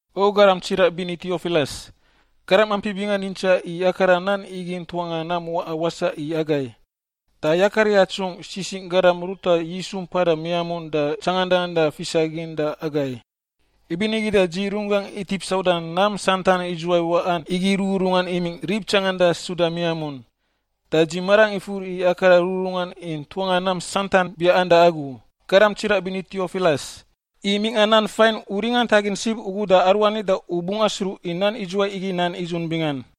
O garam tsiraꞌ bini Tiofilas, garam ampi bingan yintsaꞌ i akara nan igi ntuanga nam waꞌa wasaꞌ i agai. Da yakar yatsungꞌ sisingꞌ garam ruta Yisu mpada miamun da tsangandan da fisagin da agai. Ibinigi da dzi runggangꞌ itip sauda nam santan idzuwai waꞌan igi rururungan imingꞌ rib tsangandan suda miamun, da dzi marangꞌ ifur i akara rururungan i ntuanga nam santan biaꞌan da agu, garam tsiraꞌ bini Tiofilas, i mingꞌa nan fain u ringantagin sib ugu da aruani da u bungꞌ asruꞌ i nan idzuwai igi nan nidzun bingan.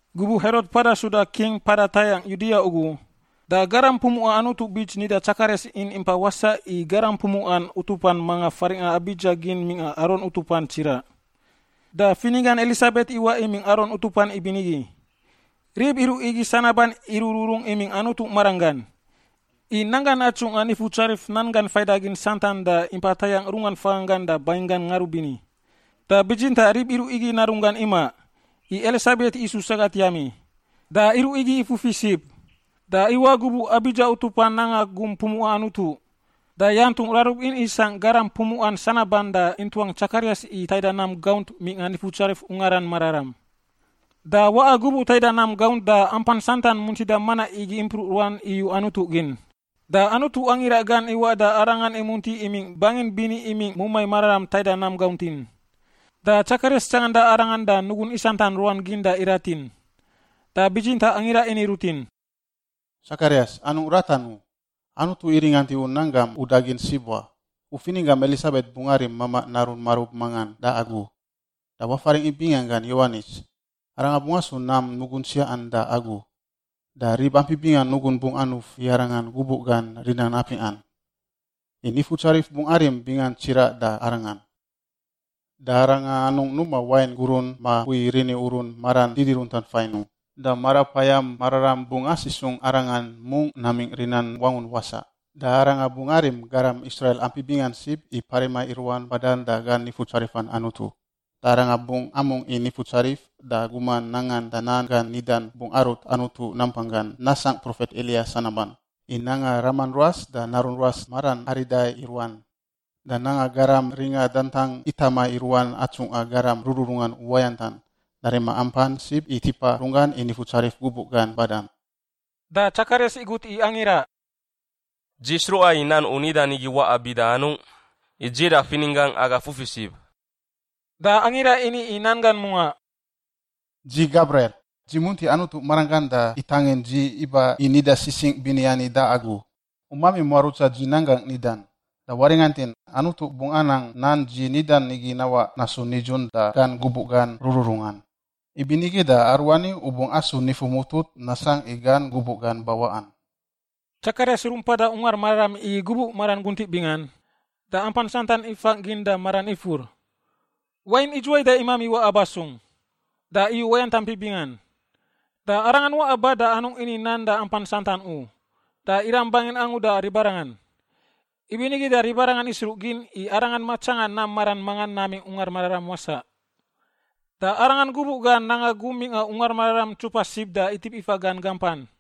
Gubuꞌ Herot mpada suda king mpada tayangꞌ Yudia ugu, da garam pumuꞌa Anutu bits nida Tsakarias in impa wasaꞌ i garam pumuꞌan utupan mangan faringꞌa Abidza gin mingꞌa Aron utupan tsiraꞌ. Da fininggan Elisabet iwaꞌ imingꞌ Aron utupan ibinigi. Rib iruꞌ igi sanaban irururung imingꞌ Anutu maranggan, i nanggan atsungꞌa Nifutsarif nan gan faidagin santan da impa tayangꞌ runggan faganggan da banginggan ngarubini. Da bitsintaꞌ rib iruꞌ igi narunggan imaꞌ, i Elisabet isu sagat yami. Da iruꞌ igi ifufi sib. Da iwaꞌ gubuꞌ Abidza utupan nanga gum pumuꞌa Anutu, da yantungꞌ rarub in isangꞌ garam pumuꞌan sanaban da intuang Tsakarias i taida nam gaunt mingꞌa Nifutsarif Ungaran Mararam. Da waꞌa gubuꞌ taida nam gaunt da ampan santan muntida manaꞌ igi impruꞌ ruan iyu Anutu gin. Da Anutu angira gan iwaꞌ da arangan imunti imingꞌ bangin bini imingꞌ mumai mararam taida nam gauntin. Da Tsakarias tsanganda arangan da nugun isantan ruan gin da iratin. Da bitsintaꞌ angira ini rutin, “Tsakarias, anungꞌ ratan u. Anutu iringant i u nan gam udagin sib wa. U fininggam Elisabet bungꞌ arim mamaꞌ narun marub mangan da agu. Da wafaringꞌ i binganggan Yowanis. Arangan bungꞌ asu nam nugun tsiaꞌan da agu, da rib ampi bingan nugun bungꞌ anuf i arangan gubuꞌ gan rinan apingꞌan, i Nifutsarif bungꞌ arim bingan tsiraꞌ da arangan. Da arangan anungꞌ numa wain gurun ma mpui rini urun maran didiruntan fain u, da Marapayam Mararam bungꞌ asisungꞌ arangan mungꞌ namingꞌ rinan wangun wasaꞌ. Da arangan bungꞌ arim garam Israil ampi bingan sib i parima i ruan badan da gan Nifutsarifan Anutu. Da arangan bungꞌ amungꞌ i Nifutsarif, da guman nangan da nan gan nidan bungꞌ arut Anutu nampanggan nasangꞌ profet Eliya sanaban, i nanga raman ruas da narun ruas maran arida i ruan, da nanga garam ringa dadantang itama i ruan atsungꞌa garam rururungan uwayantan, da rima ampan sib i tipa runggan i Nifutsarif gubuꞌ gan badan.” Da Tsakarias igut i angira, “Dzi sruꞌa i nan u nidan igi waꞌa bida anungꞌ? I dzi da fininggangꞌ aga fufi sib.” Da angira ini i nan gan mungaꞌ, “Dzi Gabriel. Dzi munti Anutu maranggan da itangin dzi iba i nida sisingꞌ bini ani da agu. U mami muarutsa dzi nan gangꞌ nidan. Da waringantin, Anutu bungꞌ anang nan dzi nidan igi nawaꞌ nasu nidzun da gan gubuꞌ gan rururungan. Ibinigi da aruani u bungꞌ asu nifu mutut nasangꞌ i gan gubuꞌ gan bawaꞌan.” Tsakarias rumpada Ungar Mararam igi gubuꞌ maran guntiꞌ bingan, da ampan santan ifangꞌ gin da maran ifur, “Wain idzuwai da imami waꞌa ba sung?” Da iyu uwayant ampi bingan. Da arangan waꞌa ba da anungꞌ ini nan da ampan santan u, da iram bangin angu da ribarangan. Ibinigi da ribarangan isruꞌgin i arangan matsanga nam maran mangan namingꞌ Ungar Mararam wasaꞌ. Da arangan gubuꞌ gan nanga gum mingꞌa Ungar Mararam ntsupa sib da itip ifa gan gampan.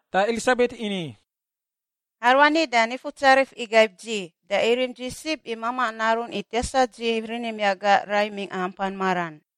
Da Elisabet ini, “Aruani da Nifutsarif igaib dzi, da irim dzi sib i mamaꞌ narun i tiasa dzi rini miaꞌ gangꞌ rai mingꞌa ampan maran.”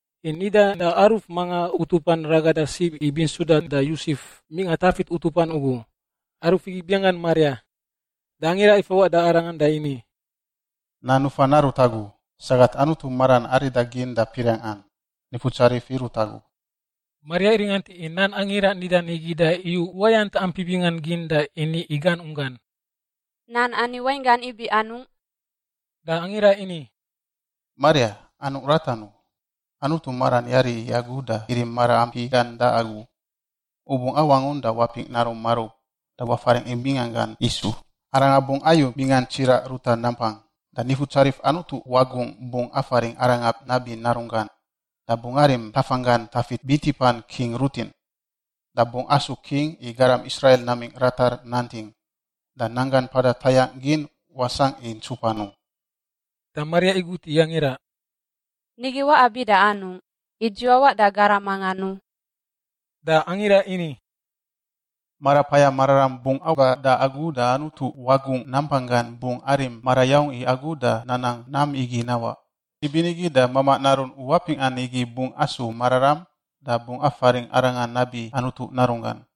i nidan da aruf mangan utupan ragada sib i bintsudan da Yosef, mingꞌa Tafit utupan ugu. Aruf igi binganggan Maria. Da angira ifawaꞌ da arangan da ini, “Nan nufan narut agu, sagat Anutu maran arida gin da piriangꞌan. Nifutsarif irut agu.” Maria iringant i nan angira nidan igi da iyu uwayant ampi bingan gin da ini i gan unggan, “Nan ani wainggan ibi anungꞌ?” Da angira ini, “Maria, anungꞌ ratan u. Anutu maran yari i agu da irim maraampi gan da agu. U bungꞌ awangun da wapingꞌ narum marub. Da wafaringꞌ i binganggan Yisu. Arangan bungꞌ ayu bingan tsiraꞌ ruta nampang. Da Nifutsarif Anutu Wagungꞌ bungꞌ afaringꞌ Arangan nabi Narunggan, da bungꞌ arim tafanggan Tafit bintipan king rutin, da bungꞌ asu king i garam Israil namingꞌ ratar nanting, da nanggan mpada tayangꞌ gin wasangꞌ i ntsupan u.” Da Maria igut i angira, “Nigi waꞌa bida anungꞌ, i dzi wawaꞌ da garam mangan u?” Da angira ini, “Marapayam Mararam bungꞌ aba da agu da Anutu Wagungꞌ nampanggan bungꞌ arim marayaung i agu da nanang nam igi nawaꞌ. Ibinigi da mamaꞌ narun u apingꞌan igi bungꞌ asu mararam da bungꞌ afaringꞌ Arangan nabi Anutu Narunggan.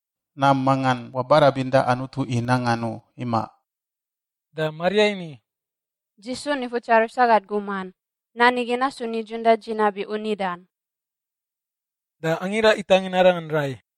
Nam mangan wabarabin da Anutu i nangan u, imaꞌ.” Da Maria ini, “Dzi su Nifutsarif sagat guman. Nan igi nasu nidzun da dzi nabi u nidan.” Da angira itangin arangan rai.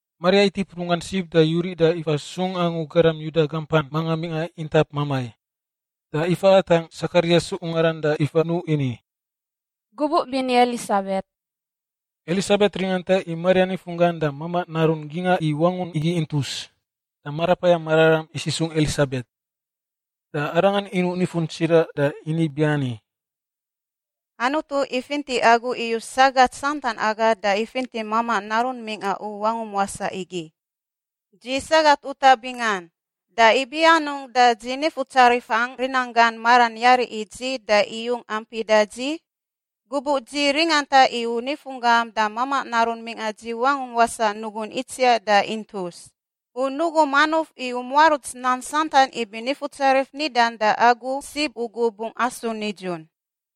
Maria itip runggan sib da yuriꞌ da ifa sung angu garam Yuda gampan mangan mingꞌa intap mamai. Da ifa atangꞌ Tsakarias ungaran da ifa nuꞌ ini, “Gubuꞌ bini, Elisabet.” Elisabet ringanta i Maria nifunggan da mamaꞌ narun gingꞌa i wangun igi intus, da Marapayam Mararam isisungꞌ Elisabet. Da arangan inuꞌ nifun tsiraꞌ da ini ibiani, “Anutu ifinti agu iyus sagat santan aga da ifinti mamaꞌ narun mingꞌa u wangum wasaꞌ igi. Dzi sagat utaꞌ bingan! Da ibi anungꞌ da dzi Nifutsarifangꞌ rinanggan maran yari i dzi da iyung ampi da dzi? Gubuꞌ dzi ringanta i u nifunggam da mamaꞌ narun mingꞌa dzi wangungꞌ wasaꞌ nugun itsiaꞌ da intus. U nugum anuf i u muaruts nan santan ibi Nifutsarif nidan da agu sib ugu bungꞌ asu nidzun.”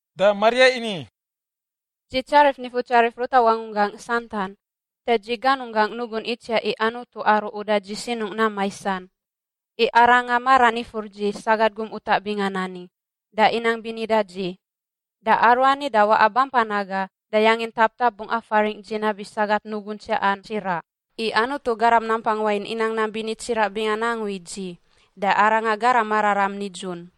Da Maria ini, “Dzi tsarif Nifutsarif ruta wangunggangꞌ santan, da dzi ganunggangꞌ nugun itsiaꞌ i Anutu aru uda dzi sinungꞌ nam maisan. I Arangan maran ifur dzi, sagat gum utaꞌ bingan ani, da inang bini da dzi. Da aruani da waꞌa bampan aga da yangin taptap bungꞌ afaringꞌ dzi nabi sagat nugun tsiaꞌan tsiraꞌ, i Anutu Garam Nampang Wain inang nam bini tsiraꞌ bingan angu i dzi, da Arangan Garam Mararam Nidzun.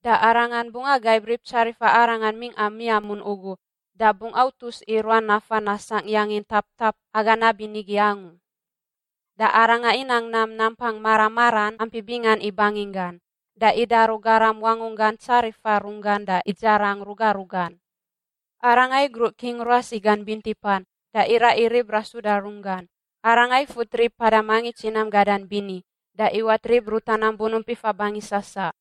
Da Arangan bungꞌ agaib rib tsarifa Arangan mingꞌa miamun ugu da bungꞌ autus i ruan nafan nasangꞌ yangin taptap aga nabinigi angu. Da Arangan inang nam nampang mara maran ampi bingan i banginggan. Da idaru garam wangunggan tsarifa runggan da idzarang ruga rugan. Arangan igruꞌ king ruas i gan bintipan, da iraꞌ i rib rasuda runggan. Arangan ifut rib mpada mangits i nam gadan bini, da iwat rib ruta nam bunump ifa bangi sasaꞌ.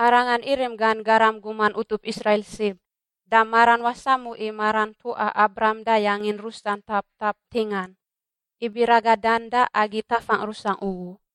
Arangan irim gan garam guman utup Israil sib, da maran wasamu i maran ntuꞌa Abraham da yangin rusan taptap ntingan, ibi ragadan da agi tafangꞌ rusangꞌ ugu.”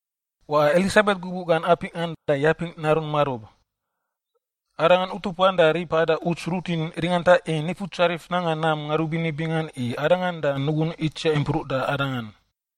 Waꞌa Elisabet gubuꞌ gan apingꞌan da yapingꞌ narun marub. Arangan utupan da rib mpada uts rutin ringanta i Nifutsarif nanga nam ngarubini bingan i arangan da nugun itsiaꞌ impruꞌ da arangan.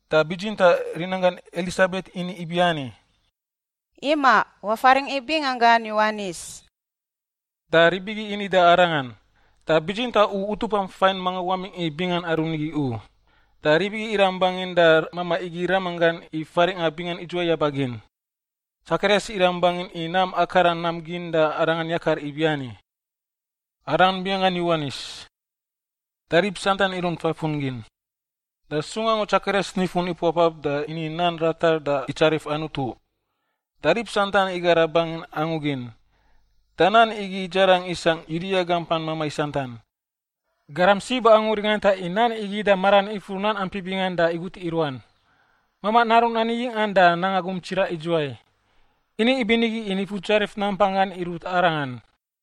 da bitsintaꞌ rinanggan Elisabet ini ibiani, “Imaꞌ! Wafaringꞌ i binganggan Yowanis.” Da rib igi ini da arangan, “Da bitsintaꞌ u utupam fain mangan wamingꞌ i bingan aru nigi u.” Da rib igi iram bangin da mamaꞌ igi ramanggan i faringꞌa bingan idzuwai yabagin. Tsakarias iram bangin i nam akara nan gin da arangan yakar ibiani, “Arangan binganggan Yowanis.” Da rib santan irunt fafun gin. Da sung angu Tsakarias nifun ipuapap da ini nan ratar da itsarif Anutu. Da rib santan igara bangin angu gin, da nan igi idzarang isangꞌ Yudia gampan mamai santan. Garam sib angu ringanta i nan igi da maran ifur nan ampi bingan da igut i ruan, “Mamaꞌ narun ani yingꞌan, da nanga gum tsiraꞌ idzuwai?” Ini ibinigi i Nifutsarif nampanggan irut arangan.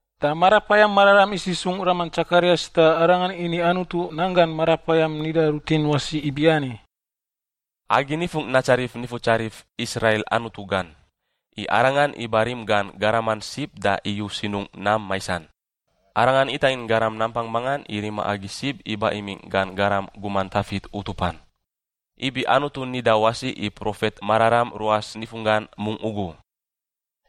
Da Marapayam Mararam isisungꞌ raman Tsakarias da arangan ini Anutu nan gan Marapayam nida rutin wasi ibiani: “Agi nifungꞌ natsarif Nifutsarif, Israil Anutu gan, i Arangan iba rim gan garaman sib da iyu sinungꞌ nam maisan. Arangan itangin Garam nampang mangan i rima agi sib iba imingꞌ gan garam guman Tafit utupan, ibi Anutu nida wasi i profet mararam ruas nifunggan mungꞌ ugu.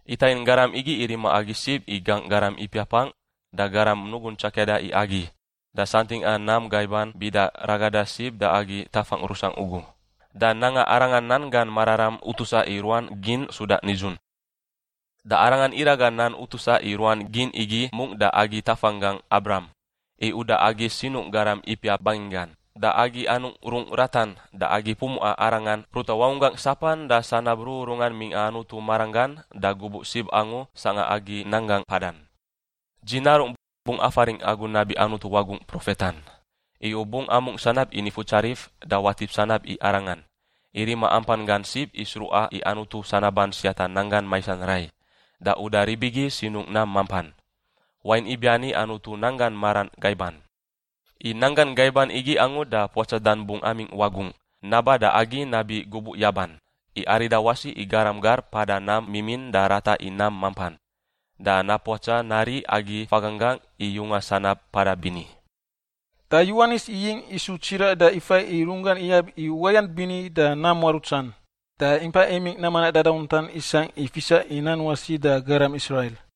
Itangin Garam igi i rima agi sib i gangꞌ garam ipiapangꞌ da garam nugun tsakiada i agi, da santingꞌa nam gaiban bida ragada sib da agi tafangꞌ rusangꞌ ugu, da nanga Arangan nan gan mararam utusa i ruan gin suda nidzun. Da Arangan iraga nan utusa i ruan gin igi mungꞌ da agi tafanggangꞌ Abraham i uda agi sinungꞌ garam ipiap banginggan, da agi anungꞌ rungꞌ ratan, da agi pumuꞌan Arangan ruta wangunggangꞌ sapan da sanab rururungan mingꞌa Anutu maranggan da gubuꞌ sib angu sangꞌa agi nanggangꞌ mpadan. Dzi narungꞌ, bungꞌ afaringꞌ agu nabi Anutu Wagungꞌ profetan. I u bungꞌ amungꞌ sanab i Nifutsarif, da watip sanab i Arangan, i rima ampan gan sib i sruꞌa i Anutu sanaban siata nanggan maisan rai da uda rib igi sinungꞌ nam mampan, wain ibiani Anutu nanggan maran gaiban. I nanggan gaiban igi angu da Puatsadan bungꞌ amingꞌ wagungꞌ naba da agi nabi gubuꞌ yaban i arida wasi i garam gar mpada nam mimin da rata i nam mampan. Da napuatsa nari agi faganggangꞌ i yunga sanab mpada bini.” Da Yowanis iyingꞌ isu tsiraꞌ da ifai i runggan iyab i uwayant bini da nam muarutsan. Da impa imingꞌ nam manaꞌ dadauntan isangꞌ i fisa i nan wasi da garam Israil.